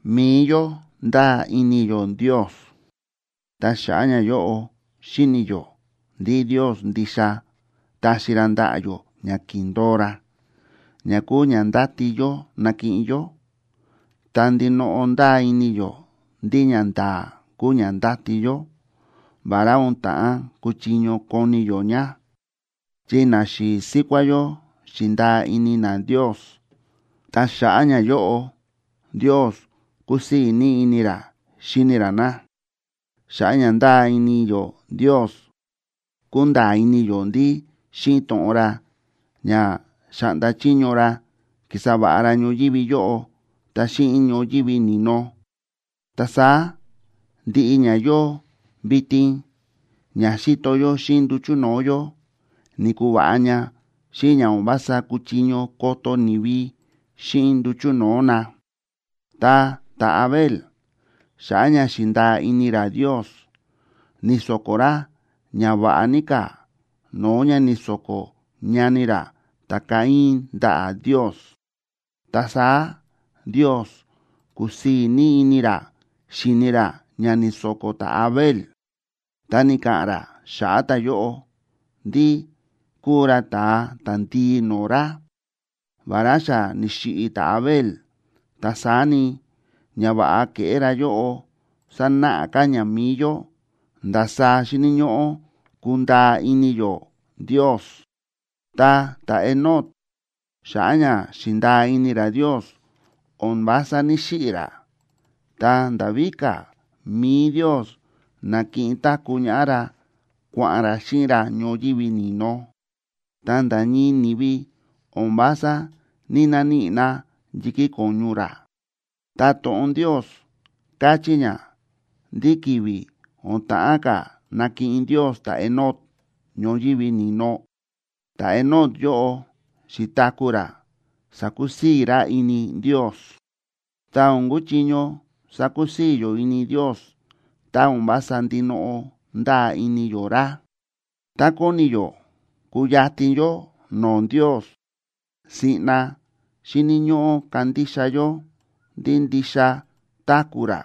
Mi̱i yó ndáa ini yó Ndios, ta xa̱ꞌa̱ ñayóꞌo xíni̱ yó ndí Ndios ndixa taxi ra ndaꞌa̱ yó ña ki̱ndo̱o ra, ña kúu ña ndáti yó nakiꞌin yó; ta ndinoꞌo ndáa ini yó ndí ñanda̱a̱ kúu ña ndáti yó, vará o̱n ta̱ꞌán kuchiño koni yó ña. Chi naxi̱i̱ síkuá yó xi̱ndaa ini na Ndios, ta xa̱ꞌa̱ ñayóꞌo Ndios kúsii̱ ní ini ra xíni ra na. Xa̱ꞌa̱ ña ndáa ini yó Ndios, kúnda̱a̱ ini yó ndí xíꞌin to̱ꞌon ra ña xa̱ꞌnda chiño ra ki̱sa va̱ꞌa ra ñoyívi yóꞌo ta xíꞌin ñoyívi ni̱no. Ta saá ndiꞌi ña yóo vitin ña xíto yó xíꞌin nduchu̱ no̱o̱ yó ni̱kuva̱ꞌa ña xíꞌin ña o̱n vása kúchiño koto ni̱vi xíꞌin nduchu̱ no̱o̱ na. Ta ta̱Abel, xa̱ꞌa̱ ña xi̱ndaa ini ra Ndios, ni̱so̱ko̱ ra ña va̱ꞌa ní ka̱ no̱o̱ ña ni̱so̱ko̱ ñani ra ta̱Caín ndaꞌa̱ Ndios, ta saá Ndios ku̱sii̱ ní ini ra xi̱ni ra ña ni̱so̱ko̱ ta̱Abel, ta ni̱ka̱ꞌa̱n ra xa̱ꞌa̱ ta̱yóꞌo ndí kúu ra ta̱a ta̱ndii no̱o̱ ra. Vará xa ni̱xiꞌi̱ ta̱Abel, ta saá ni, ñava̱ꞌa ke̱ꞌé ra yóꞌo sánáꞌa ka̱ ña mi̱i yó ndasaá xíni̱ ñóꞌó kundaa ini yó Ndios. Ta ta̱Enoc, xa̱ꞌa̱ ña xi̱ndaa ini ra Ndios, o̱n vása ní‑xiꞌi̱ ra. Ta nda̱ víka̱, mi̱i Ndios na̱kiꞌin táku̱ ñaꞌá ra kua̱ꞌa̱n ra xíꞌin ra ñoyívi ni̱no; ta nda̱ ñii ni̱vi o̱n vása ní‑naníꞌi na yi̱kí ko̱ñu ra. Ta to̱ꞌon Ndios káchí ña ndí ki̱vi̱ o̱n ta̱ꞌán ka̱ nakiꞌin Ndios ta̱Enoc ñoyívi ni̱no, ta̱Enoc yóꞌo xi̱taku̱ ra sa̱kusii̱ ra ini Ndios. Ta o̱n kuchiño sakusii̱ yó ini Ndios tá o̱n vása ndinoꞌo ndáa ini yó ra. Tá kóni yó kuyatin yó no̱o̱ Ndios, siꞌna xíni̱ ñóꞌó kandixa yó ndí ndixa táku̱ ra,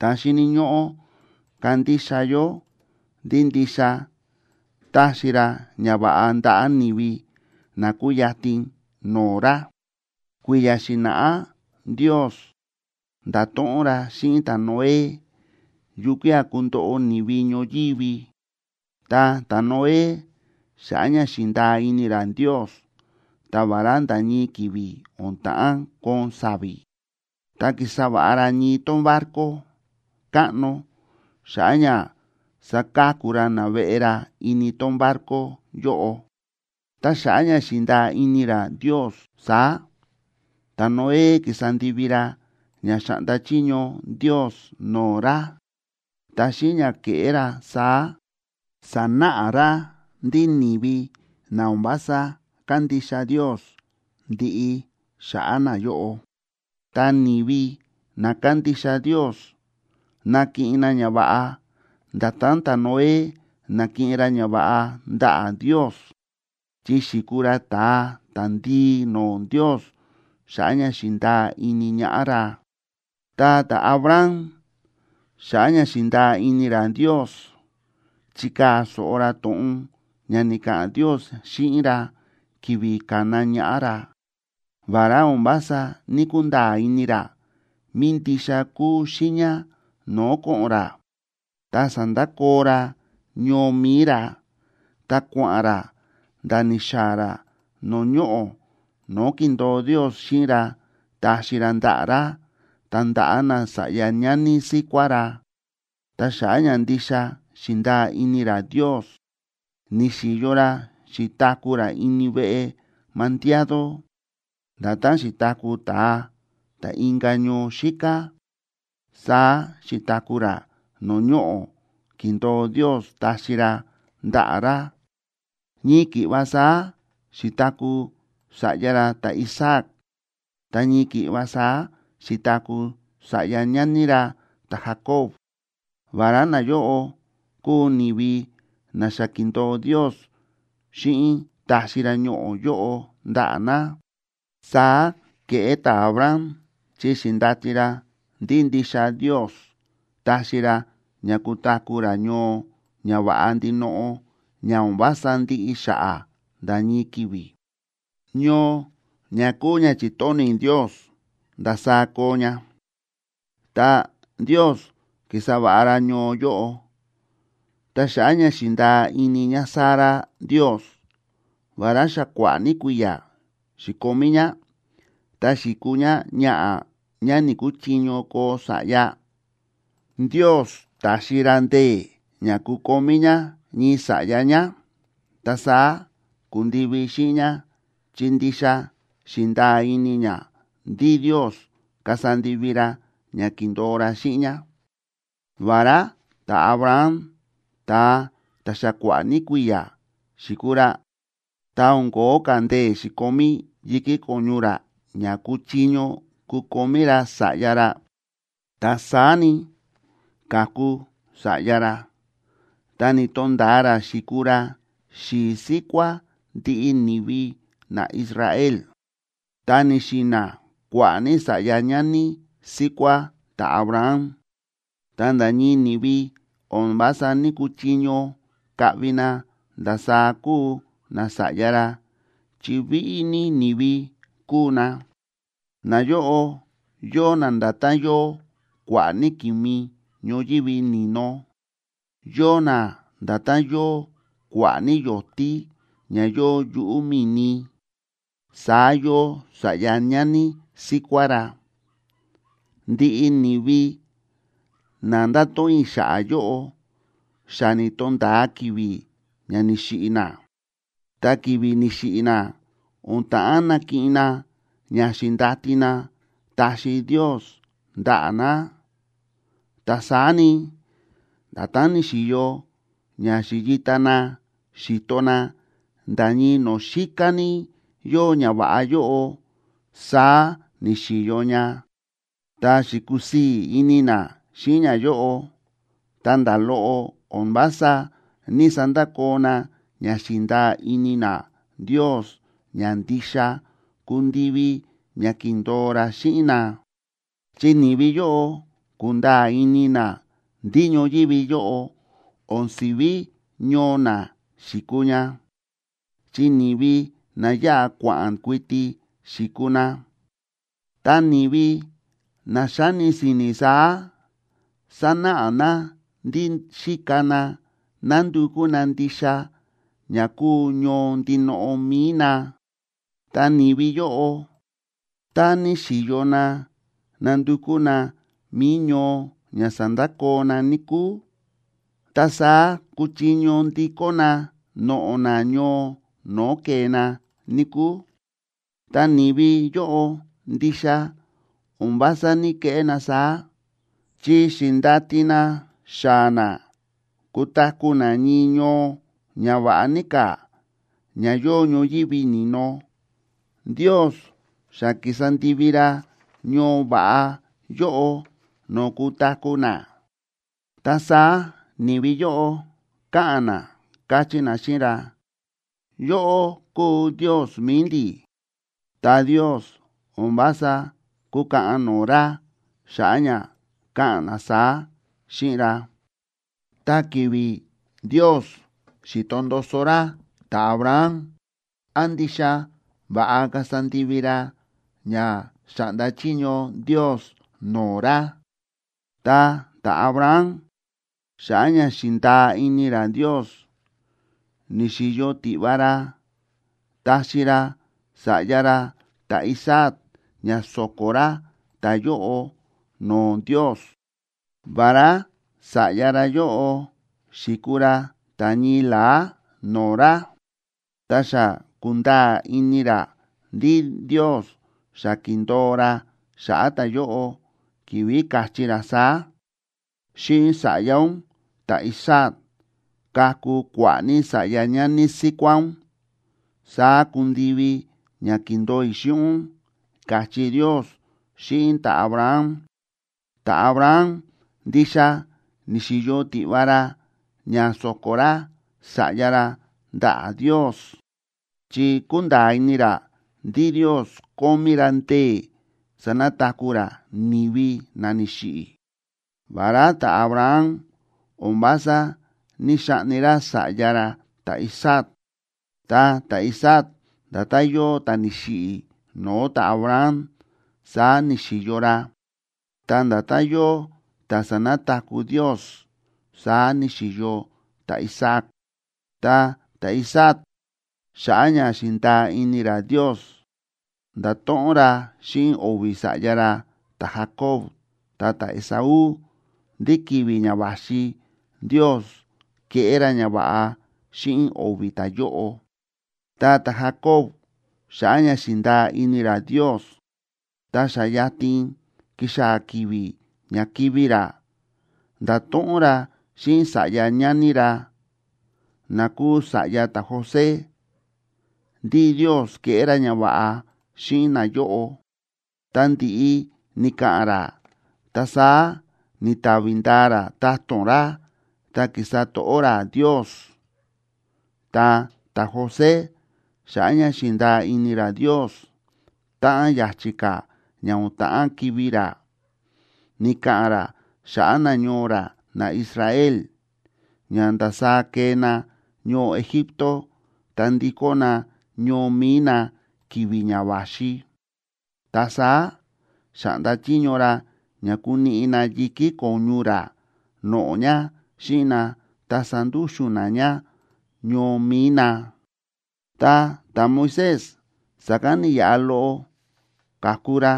ta xíni̱ ñóꞌó kandixa yó ndí ndixa taxi ra ñava̱ꞌa ndaꞌa̱ ni̱vi na kúyatin no̱o̱ ra. Kui̱ya̱ xi̱na̱ꞌá Ndios nda̱to̱ꞌon ra xíꞌin ta̱Noé yukía̱ kundoꞌo ni̱vi ñoyívi. Ta ta̱Noé, xa̱ꞌa̱ ña xi̱ndaa ini ra Ndios, ta vará nda̱ ñii ki̱vi̱ o̱n ta̱ꞌán koon sa̱vi̱, ta ki̱sa va̱ꞌa ra ñii tón barco káꞌno xa̱ꞌa̱ ña saka̱ku ra naveꞌe ra ini tón barco yóꞌo. Ta xa̱ꞌa̱ ña xi̱ndaa ini ra Ndios saá, ta̱Noé ki̱sa ndivi ra ña xa̱ꞌnda chiño Ndios no̱o̱ ra, ta xíꞌin ña ke̱ꞌé ra saá, sa̱náꞌa ra ndí ni̱vi na o̱n vása kándixa Ndios, ndiꞌi xa̱ꞌa̱ nayóꞌo. Ta ni̱vi na kándixa Ndios, nakiꞌin na ñava̱ꞌa nda̱tán ta̱Noé na̱kiꞌin ra ñava̱ꞌa ndaꞌa̱ Ndios, chi xi̱kuu ra ta̱a ta̱ndii no̱o̱ Ndios xa̱ꞌa̱ ña xi̱ndaa ini ñaꞌá ra. Ta ta̱Abraham, xa̱ꞌa̱ ña xi̱ndaa ini ra Ndios, chi̱kaa̱ so̱ꞌo ra to̱ꞌon ña ni̱ka̱ꞌa̱n Ndios xíꞌin ra ki̱vi̱ ka̱na ñaꞌá ra. Vará o̱n vása ní‑kunda̱a̱ ini ra mí ndixa kúu xiiña no̱o̱ ko̱ꞌo̱n ra, ta sa̱ndakoo ra ñoo mi̱i ra, ta kua̱ꞌa̱n ra nda̱ ni̱xaa̱ ra no̱o̱ ñoꞌo̱ no̱o̱ ki̱ndo̱o Ndios xíꞌin ra taxi ra ndaꞌa̱ ra ta ndaꞌa̱ nasa̱ꞌya ñani síkuá ra. Ta xa̱ꞌa̱ ña ndixa xi̱ndaa ini ra Ndios, ni̱xi̱yo ra xi̱taku̱ ra ini veꞌe mandiado, nda̱tán xi̱taku̱ ta̱a ta̱ inka̱ ñoo xíká, saá xi̱taku̱ ra no̱o̱ ñoꞌo̱ ki̱ndo̱o Ndios taxi ra ndaꞌa̱ ra. Ñii ki̱ꞌva saá xi̱taku̱ sa̱ꞌya ra ta̱Isaac, ta ñii ki̱ꞌva saá xi̱taku̱ sa̱ꞌya ñani ra ta̱Jacob, vará nayóꞌo kúu ni̱vi na xa ki̱ndo̱o Ndios xíꞌin taxi ra ñoꞌo̱ yóꞌo ndaꞌa̱ na. Saá ke̱ꞌé ta̱Abraham chi xi̱ndati ra ndí ndixa Ndios taxi ra ña kutaku̱ ra ñoo ña va̱ꞌa ndinoꞌo ña o̱n vása ndiꞌi xa̱ꞌa̱ nda̱ ñii ki̱vi̱, ñoo ña kúu ña chi̱tóni̱ Ndios ndasaá koo ña, ta Ndios ki̱sa va̱ꞌa ra ñoo yóꞌo. Ta xa̱ꞌa̱ ña xi̱ndaa ini ñáSara Ndios, vará xa kua̱ꞌa̱ ní kui̱ya̱ xi̱komí ñá, ta xi̱kuu ñáñaꞌa̱ ñá ni̱‑kuchiño koo sa̱ꞌya, Ndios ta̱xi ra ndee̱ ña kukomí ñá ñii sa̱ꞌya ñá. Ta saá ku̱ndivi xíꞌin ñá chi ndixa xi̱ndaa ini ñá ndí Ndios kasa ndivi ra ña ki̱ndo̱o ra xíꞌin ñá. Vará ta̱Abraham ta̱a ta̱ xa kua̱ꞌa̱ ní kui̱ya̱ xi̱kuu ra, ta o̱n ko̱ó ka̱ ndee̱ xi̱komí yi̱kí ko̱ñu ra ña kuchiño kukomí ra sa̱ꞌya ra, ta saá ni, ka̱ku sa̱ꞌya ra, ta ni̱to̱nda̱a ra xi̱kuu ra xi̱i̱ síkuá ndiꞌi ni̱vi naIsrael. Ta ni̱xi̱na̱ kua̱ꞌa̱ ní sa̱ꞌya ñani síkuá ta̱Abraham, ta nda̱ ñii ni̱vi o̱n vása ní‑kuchiño kaꞌvi na ndasaá kúu nasa̱ꞌya ra chi víꞌí ní ni̱vi kúu na. Nayóꞌo yóo na nda̱tán yóo kua̱ꞌa̱ ní ki̱mi ñoyívi ni̱no, yóo na nda̱tán yóo kua̱ꞌa̱ ní yo̱tí ña yóo yuꞌu̱ mi̱ni, saá yóo sa̱ꞌya ñani síkuá ra. Ndiꞌi ni̱vi na nda̱to̱ꞌon i̱ xa̱ꞌa̱ yóꞌo, xa ni̱to̱nda̱a ki̱vi̱ ña ni̱xiꞌi̱ na. Ta ki̱vi̱ ni̱xiꞌi̱ na, o̱n ta̱ꞌán nakiꞌin na ña xi̱ndati na taxi Ndios ndaꞌa̱ na, ta saá ni, nda̱tán ni̱xi̱yo ña xi̱yita na xi̱to na nda̱ ñii no̱o̱ xíká ní yóo ñava̱ꞌa yóꞌo, saá ni̱xi̱yo ña, ta xi̱kusii̱ ini na xíꞌin ñayóꞌo. Ta nda̱ loꞌo o̱n vása ní‑sandakoo na ña xi̱ndaa ini na Ndios ña ndixa kundivi ña ki̱ndo̱o ra xíꞌin na. Chi ni̱vi yóꞌo ku̱nda̱a̱ ini na ndí ñoyívi yóꞌo o̱n si̱ví ñoo na xi̱kuu ña, chi ni̱vi na yáꞌa kua̱ꞌa̱n kuiti xi̱kuu na. Ta ni̱vi na xáni si̱ni̱ saá, sánáꞌa na ndí xíka na nándukú na ndixa ña kúu ñoo ndinoꞌo mi̱i na. Ta ni̱vi yóꞌo, tá níxi̱yo na nándukú na mi̱i ñoo ña sa̱ndakoo na, níkúu, ta saá kuchiño ndikó na noꞌo̱ na ñoo no̱o̱ ke̱e na, níkúu. Ta ni̱vi yóꞌo ndixa o̱n vása ní‑keꞌé na saá, chi xi̱ndati na xaa̱ na kutaku̱ na ñii ñoo ña va̱ꞌa ní ka̱ ña yóo ñoyívi ni̱no. Ndios xa ki̱sa ndivi ra ñoo va̱ꞌa yóꞌo no̱o̱ kutaku̱ na, ta saá ni̱vi yóꞌo káꞌa̱n na, káchí na xíꞌin ra: “Yóꞌó kúu Ndios mi̱i ndi̱.” Ta Ndios o̱n vása kúkaꞌan no̱o̱ ra xa̱ꞌa̱ ña káꞌa̱n na saá xíꞌin ra. Ta ki̱vi̱ Ndios xi̱to ndoso ra ta̱Abraham án ndixa va̱ꞌa kasa ndivi ra ña xa̱ꞌnda chiño Ndios no̱o̱ ra, ta ta̱Abraham, xa̱ꞌa̱ ña xi̱ndaa ini ra Ndios, ni̱xi̱yo tiꞌva ra taxi ra sa̱ꞌya ra ta̱Isaac ña so̱ko̱ ra ta̱yóꞌo no̱o̱ Ndios, vará sa̱ꞌya ra yóꞌo xi̱kuu ra ta̱ ñii la̱á no̱o̱ ra. Ta xa ku̱nda̱a̱ ini ra ndí Ndios xa ki̱ndo̱o ra xa̱ꞌa̱ ta̱yóꞌo, ki̱vi̱ káchí ra saá: “Xíꞌin sa̱ꞌya ún ta̱Isaac kaku kua̱ꞌa̱ ní sa̱ꞌya ñani síkuá ún, saá kundivi ña ki̱ndo̱o i̱ xíꞌin ún”, káchí Ndios xíꞌin ta̱Abraham. Ta̱Abraham ndixa ni̱xi̱yo tiꞌva ra ña so̱ko̱ ra sa̱ꞌya ra ndaꞌa̱ Ndios, chi kúnda̱a̱ ini ra ndí Ndios kómí ra ndee̱ sanataku̱ ra ni̱vi na ni̱xiꞌi̱. Vará ta̱Abraham o̱n vása ní‑xaꞌni ra sa̱ꞌya ra ta̱Isaac, ta ta̱Isaac nda̱tán yóo ta̱ ni̱xiꞌi̱ no̱o̱ ta̱Abraham, saá ni̱xi̱yo ra, ta nda̱tán yóo ta̱ sa̱nataku̱ Ndios, saá ni̱xi̱yo ta̱Isaac. Ta ta̱Isaac, xa̱ꞌa̱ ña xi̱ndaa ini ra Ndios, nda̱to̱ꞌon ra xíꞌin o̱vi̱ sa̱ꞌya ra ta̱Jacob ta ta̱Esaú ndí ki̱vi̱ ña va̱xi Ndios keꞌé ra ñava̱ꞌa xíꞌin o̱vi̱ ta̱yóꞌo. Ta ta̱Jacob, xa̱ꞌa̱ ña xi̱ndaa ini ra Ndios, tá xa yatin ki̱xaa̱ ki̱vi̱ ña kivi̱ ra, nda̱to̱ꞌon ra xíꞌin sa̱ꞌya ñani ra, na kúu sa̱ꞌya ta̱José, ndí Ndios keꞌé ra ñava̱ꞌa xíꞌin nayóꞌo. Ta ndi̱ꞌi ni̱ka̱ꞌa̱n ra, ta saá ni̱tavi ndaa ra ta̱to̱n ra ta ki̱sa to̱ꞌó ra Ndios. Ta ta̱José, xa̱ꞌa̱ ña xi̱ndaa ini ra Ndios, táꞌan ya̱chi̱ ka̱ ña o̱n ta̱ꞌán kivi̱ ra, ni̱ka̱ꞌa̱n ra xa̱ꞌa̱ nañoo ra naIsrael ña ndasaá kee na ñoo Egipto ta ndikó na ñoo mi̱i na ki̱vi̱ ña va̱xi. Ta saá xa̱ꞌnda chiño ra ña kuniꞌi na yi̱kí ko̱ñu ra noꞌo̱ ña xíꞌin na ta sandúxu̱n na ña ñoo mi̱i na. Ta ta̱Moisés sa̱kán ni̱yaꞌa loꞌo ka̱ku ra,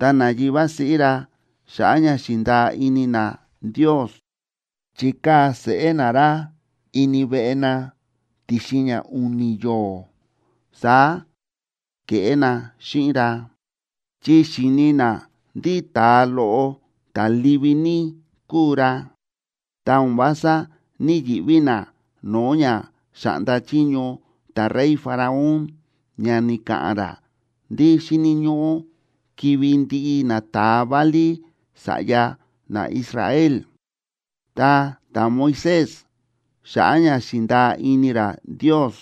ta nayivá siꞌí ra, xa̱ꞌa̱ ña xi̱ndaa ini na Ndios, chi̱kaa̱ seꞌé na ra ini veꞌe na ti̱xin ña u̱ni̱ yo̱o̱. Saá ke̱ꞌé na xíꞌin ra, chi xi̱ni na ndí ta̱a loꞌo ta̱ livi ní kúu ra, ta o̱n vása ní‑yiꞌví na no̱o̱ ña xa̱ꞌnda chiño ta̱rey Faraón ña ni̱ka̱ꞌa̱n ra ndí xíni̱ ñóꞌó kivi̱ ndiꞌi nata̱a válí sa̱ꞌya naIsrael. Ta ta̱Moisés, xa̱ꞌa̱ ña xi̱ndaa ini ra Ndios,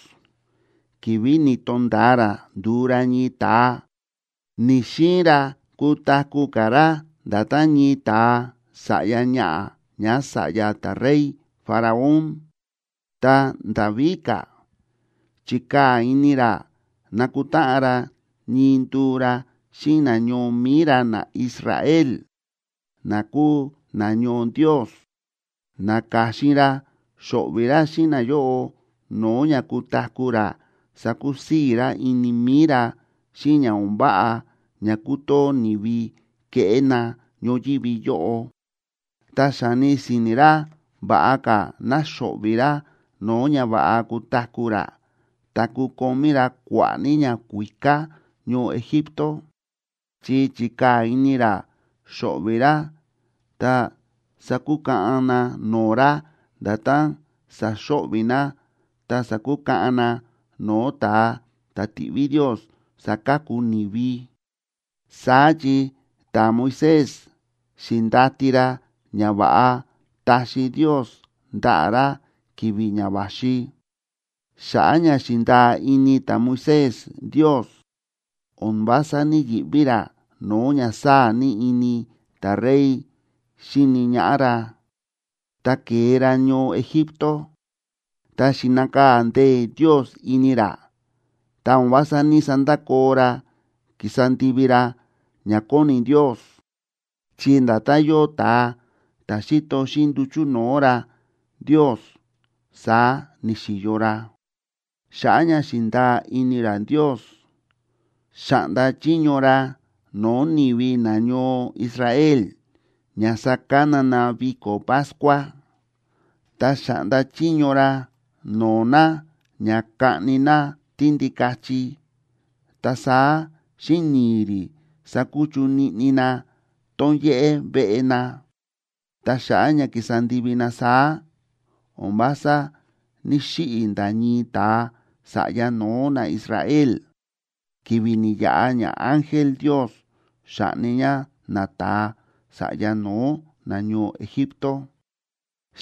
ki̱vi̱ ni̱to̱nda̱a ra ndu̱u ra ñii ta̱a, ni̱‑xiin ra kutaku̱ ka̱ ra nda̱tán ñii ta̱a sa̱ꞌya ñaꞌa̱ ñása̱ꞌya ta̱rey Faraón. Ta nda̱ víka̱, chi̱kaa̱ ini ra nakutáꞌan ra ñii nduu ra xíꞌin nañoo mi̱i ra naIsrael, na kúu nañoo Ndios. Na̱ka̱xin ra xo̱ꞌvi̱ ra xíꞌin nayóꞌo no̱o̱ ña kutaku̱ ra sakusii̱ ra ini mi̱i ra xíꞌin ña o̱n váꞌa ña kútoo ni̱vi kéꞌé na ñoyívi yóꞌo. Ta xa̱ni si̱ni̱ ra va̱ꞌa ka̱ ná xo̱ꞌvi̱ ra no̱o̱ ña va̱ꞌa kutaku̱ ra ta kukomí ra kua̱ꞌa̱ ní ñakuíká ñoo Egipto. Chi chi̱kaa̱ ini ra xo̱ꞌvi̱ ra ta sakukaꞌan na no̱o̱ ra nda̱tán saxo̱ꞌvi̱ na ta sakukaꞌan na no̱o̱ ta̱a ta̱ tiꞌví Ndios saka̱ku ni̱vi, saá chi ta̱Moisés xi̱ndati ra ñava̱ꞌa taxi Ndios ndaꞌa̱ ra ki̱vi̱ ña va̱xi. Xa̱ꞌa̱ ña xi̱ndaa ini ta̱Moisés Ndios, o̱n vása ní‑yiꞌví ra no̱o̱ ña sáa̱ ní ini ta̱rey xíni ñaꞌá ra. Ta ke̱e ra ñoo Egipto, ta xi̱nakaa̱ ndee̱ Ndios ini ra ta o̱n vása ní‑sandakoo ra ki̱sa ndivi ra ña kóni Ndios, chi nda̱tán yóo ta̱a ta̱ xíto xíꞌin nduchu̱ no̱o̱ ra Ndios, saá ni̱xi̱yo ra. Xa̱ꞌa̱ ña xi̱ndaa ini ra Ndios, xa̱ꞌnda chiño ra no̱o̱ ni̱vi nañoo Israel ña sakana na viko̱ Pascua. Ta xa̱ꞌnda chiño ra no̱o̱ na ña kaꞌni na tíndikachi, ta saá xíꞌin ni̱i̱ rí sakuchu niꞌni na tón yéꞌé veꞌe na. Ta xa̱ꞌa̱ ña ki̱sa ndivi na saá, o̱n vása ní‑xiꞌi̱ nda̱ ñii ta̱a sa̱ꞌya no̱ó naIsrael, ki̱vi̱ ni̱yaꞌa ñaángel Ndios xa̱ꞌni ña nata̱a sa̱ꞌya no̱ó nañoo Egipto.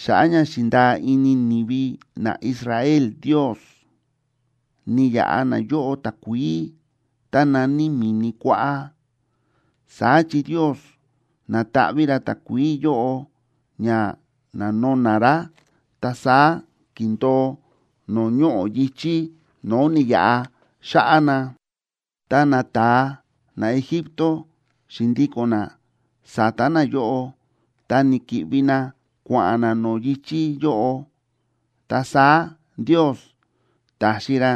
Xa̱ꞌa̱ ña xi̱ndaa ini ni̱vi naIsrael Ndios, ni̱yaꞌa nayóꞌo takuií tá na̱ní Mi̱ni Kuáꞌá, saá chi Ndios na̱taꞌví ra takuií yóꞌo ña na̱no̱na̱ rá, ta saá ki̱ndo̱o no̱o̱ ñoꞌo̱ yi̱chí no̱o̱ ni̱yaꞌa xa̱ꞌa̱ na. Tá nata̱a naEgipto xi̱ndíko̱n na sa̱ta̱ nayóꞌo ta ni̱ki̱ꞌvi na kua̱ꞌa̱n na no̱o̱ yi̱chí yóꞌo, ta saá Ndios ta̱xi ra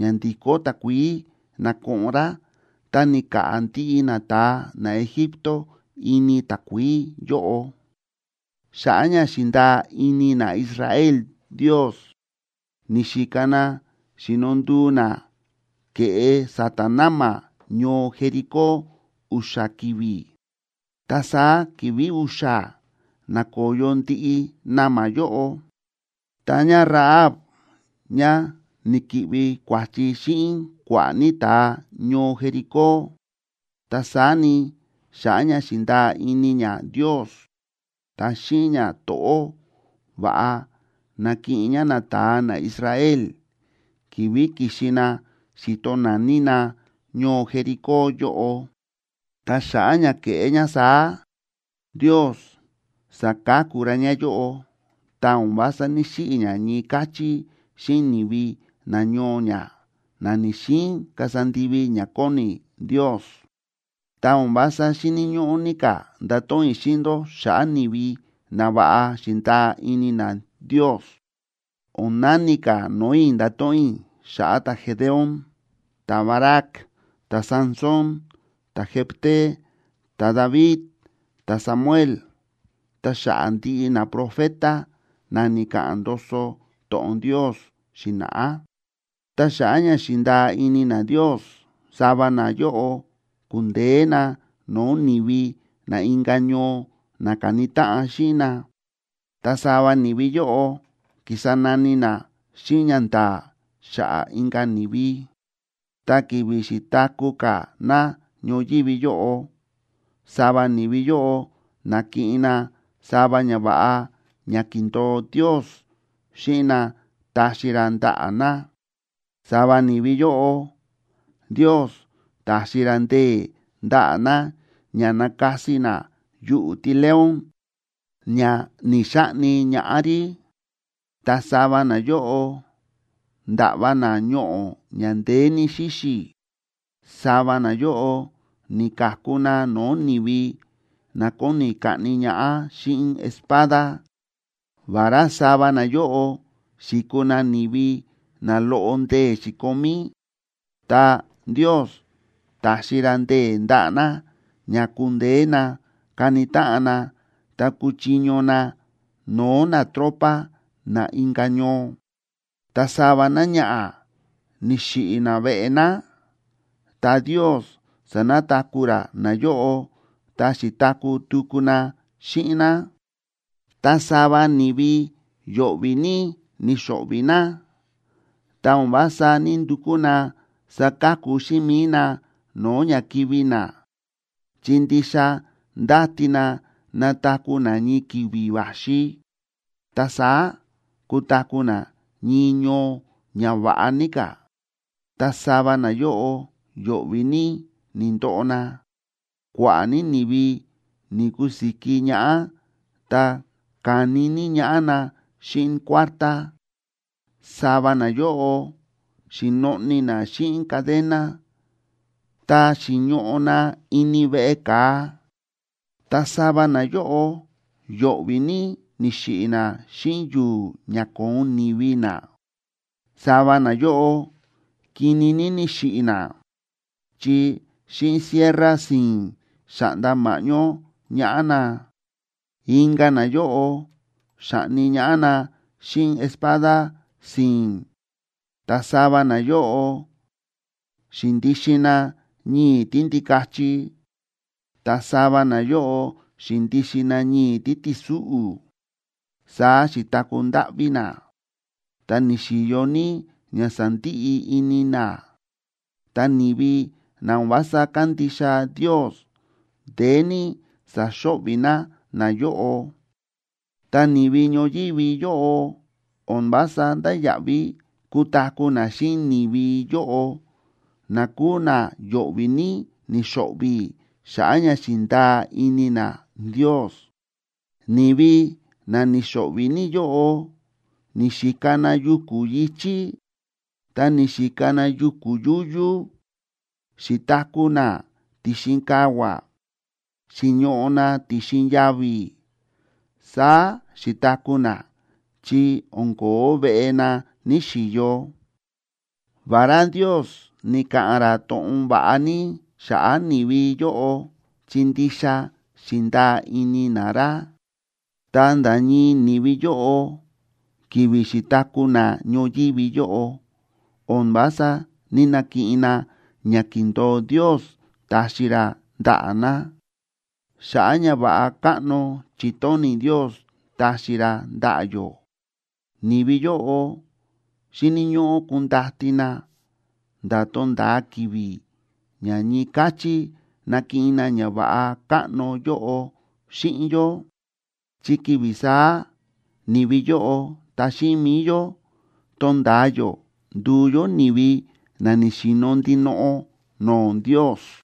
ña ndi̱kó takuií na̱koꞌon rá, ta ni̱ka̱ꞌa̱ ndiꞌi nata̱a naEgipto ini takuií yóꞌo. Xa̱ꞌa̱ ña xi̱ndaa ini naIsrael Ndios, ni̱xika na xi̱no nduu na ke̱ꞌe sa̱ta̱ na̱ma̱ ñoo Jericó u̱xa̱ ki̱vi̱, ta saá ki̱vi̱ u̱xa̱ na̱koyo ndiꞌi na̱ma̱ yóꞌo. Ta ñáRahab, ñá ni̱ki̱ꞌvi kua̱chi xíꞌin kua̱ꞌa̱ ní ta̱a ñoo Jericó, ta saá ni, xa̱ꞌa̱ ña xi̱ndaa ini ñá Ndios, ta xíꞌin ñato̱ꞌó va̱ꞌa na̱kiꞌin ñá nata̱a naIsrael ki̱vi̱ ki̱xi na xi̱to naní na ñoo Jericó yóꞌo. Ta xa̱ꞌa̱ ña ke̱ꞌé ñá saá, Ndios sa̱ka̱ku ra ñáyóꞌo, ta o̱n vása ní‑xiꞌi̱ ñá ñii káchí xíꞌin ni̱vi nañoo ñá, na ni̱‑xiin kasa ndivi ña kóni Ndios. Ta o̱n vása xíni̱ ñóꞌó ní ka̱ ndato̱ꞌon i̱ xíꞌin ndó xa̱ꞌa̱ ni̱vi na va̱ꞌa xi̱ndaa ini na Ndios. O̱n nani ka̱ no̱o̱ i̱ ndato̱ꞌon i̱ xa̱ꞌa̱ ta̱Gedeón, ta̱Barac, ta̱Sansón, ta̱Jefté, ta̱David, ta̱Samuel, ta xa̱ꞌa̱ ndiꞌi naprofeta na ni̱ka̱ꞌa̱n ndoso to̱ꞌon Ndios xi̱na̱ꞌá. Ta xa̱ꞌa̱ ña xi̱ndaa ini na Ndios, sava nayóꞌo ku̱ndeé na no̱o̱ ni̱vi na inka̱ ñoo na ka̱ni táꞌan xíꞌin na. Ta sava ni̱vi yóꞌo ki̱sa nani na xíꞌin ñanda̱a̱ xa̱ꞌa̱ inka̱ ni̱vi. Ta ki̱vi̱ xi̱taku̱ ka̱ na ñoyívi yóꞌo, sava ni̱vi yóꞌo na̱kiꞌin na sava ñava̱ꞌa ña ki̱ndo̱o Ndios xíꞌin na taxi ra ndaꞌa̱ na. Sava ni̱vi yóꞌo, Ndios ta̱xi ra ndee̱ ndaꞌa̱ na ña na̱kasi na yuꞌu̱ tíleón ña ni̱‑xaꞌni ñaꞌá rí. Ta sava nayóꞌo nda̱ꞌva na ñoꞌo̱ ña ndeé ní xíxi̱. Sava nayóꞌo ni̱ka̱ku na no̱o̱ ni̱vi na kóni kaꞌni ñaꞌá xíꞌin espada. Vará sava nayóꞌo xi̱kuu na ni̱vi na loꞌo ndee̱ xi̱komí, ta Ndios ta̱xi ra ndee̱ ndaꞌa̱ na ña ku̱ndeé na ka̱ni táꞌan na ta ku̱chiño na no̱o̱ natropa na inka̱ ñoo. Ta sava náñaꞌa̱, ni̱xiꞌi̱ naveꞌe ná, ta Ndios sa̱nataku̱ ra nayóꞌo ta xi̱taku̱ tuku na xíꞌin ná. Ta sava ni̱vi yo̱ꞌvi̱ ní ni̱xo̱ꞌvi̱ na, ta o̱n vása ní‑ndukú na saka̱ku xíꞌin mi̱i na no̱o̱ ña kivi̱ na, chi ndixa ndáti na nataku̱ na ñii ki̱vi̱ va̱xi, ta saá kutaku̱ na ñii ñoo ña va̱ꞌa ní ka̱. Ta sava nayóꞌo yo̱ꞌvi̱ ní ni̱ndoꞌo na, kua̱ꞌa̱ ní ni̱vi ni̱kusiki ñaꞌá ta ka̱ni ní ñaꞌá na xíꞌin kuártá. Sava nayóꞌo xi̱noꞌni na xíꞌin cadena ta xi̱ñoꞌo na ini veꞌe ka̱a. Ta sava nayóꞌo yo̱ꞌvi̱ ní ni̱xiꞌi̱ na xíꞌin yu̱u̱ ña ko̱on ni̱vi na. Sava nayóꞌo kini ní ni̱xiꞌi̱ na, chi xíꞌin sierra si̱i̱n xa̱ꞌnda ma̱ꞌñó ñaꞌá na, inka̱ nayóꞌo xa̱ꞌni ñaꞌá na xíꞌin espada si̱i̱n. Ta sava nayóꞌo xi̱ndixin na ñii̱ tíndikachi, ta sava nayóꞌo xi̱ndixin na ñii̱ títi̱súꞌu̱, saá xi̱taku̱ ndáꞌví na, ta ni̱xi̱yo ní ña sándiꞌi ini na, ta ni̱vi na o̱n vása kándixa Ndios ndeé ní sa̱xo̱ꞌvi̱ na nayóꞌo. Ta ni̱vi ñoyívi yóꞌo o̱n vása ndáya̱ꞌví kutaku̱ na xíꞌin ni̱vi yóꞌo na kúu na yo̱ꞌvi̱ ní ni̱xo̱ꞌvi̱ xa̱ꞌa̱ ña xi̱ndaa ini na Ndios. Ni̱vi na ni̱xo̱ꞌvi̱ ní yóꞌo ni̱xika na yuku̱ yi̱chí ta ni̱xika na yuku̱ yúyú, xi̱taku̱ na ti̱xin kavua̱, xi̱ñoꞌo na ti̱xin yavi̱, saá xi̱taku̱ na, chi o̱n ko̱ó veꞌe na ni̱‑xiyo. Vará Ndios ni̱ka̱ꞌa̱n ra to̱ꞌon va̱ꞌa ní xa̱ꞌa̱ ni̱vi yóꞌo chi ndixa xi̱ndaa ini na ra, ta nda̱ ñii ni̱vi yóꞌo, ki̱vi̱ xi̱taku̱ na ñoyívi yóꞌo, o̱n vása ní‑nakiꞌin na ña ki̱ndo̱o Ndios taxi ra ndaꞌa̱ na. Xa̱ꞌa̱ ñava̱ꞌa káꞌno chi̱tóni̱ Ndios taxi ra ndaꞌa̱ yó, ni̱vi yóꞌo xíni̱ ñóꞌó kundati na nda̱ tonda̱a ki̱vi̱ ña ñii káchí nakiꞌin na ñava̱ꞌa káꞌno yóꞌo xíꞌin yó, chi ki̱vi̱ saá ni̱vi yóꞌo ta xíꞌin mi̱i yó, tonda̱a yó nduu yó ni̱vi na ni̱xi̱no̱ ndinoꞌo no̱o̱ Ndios.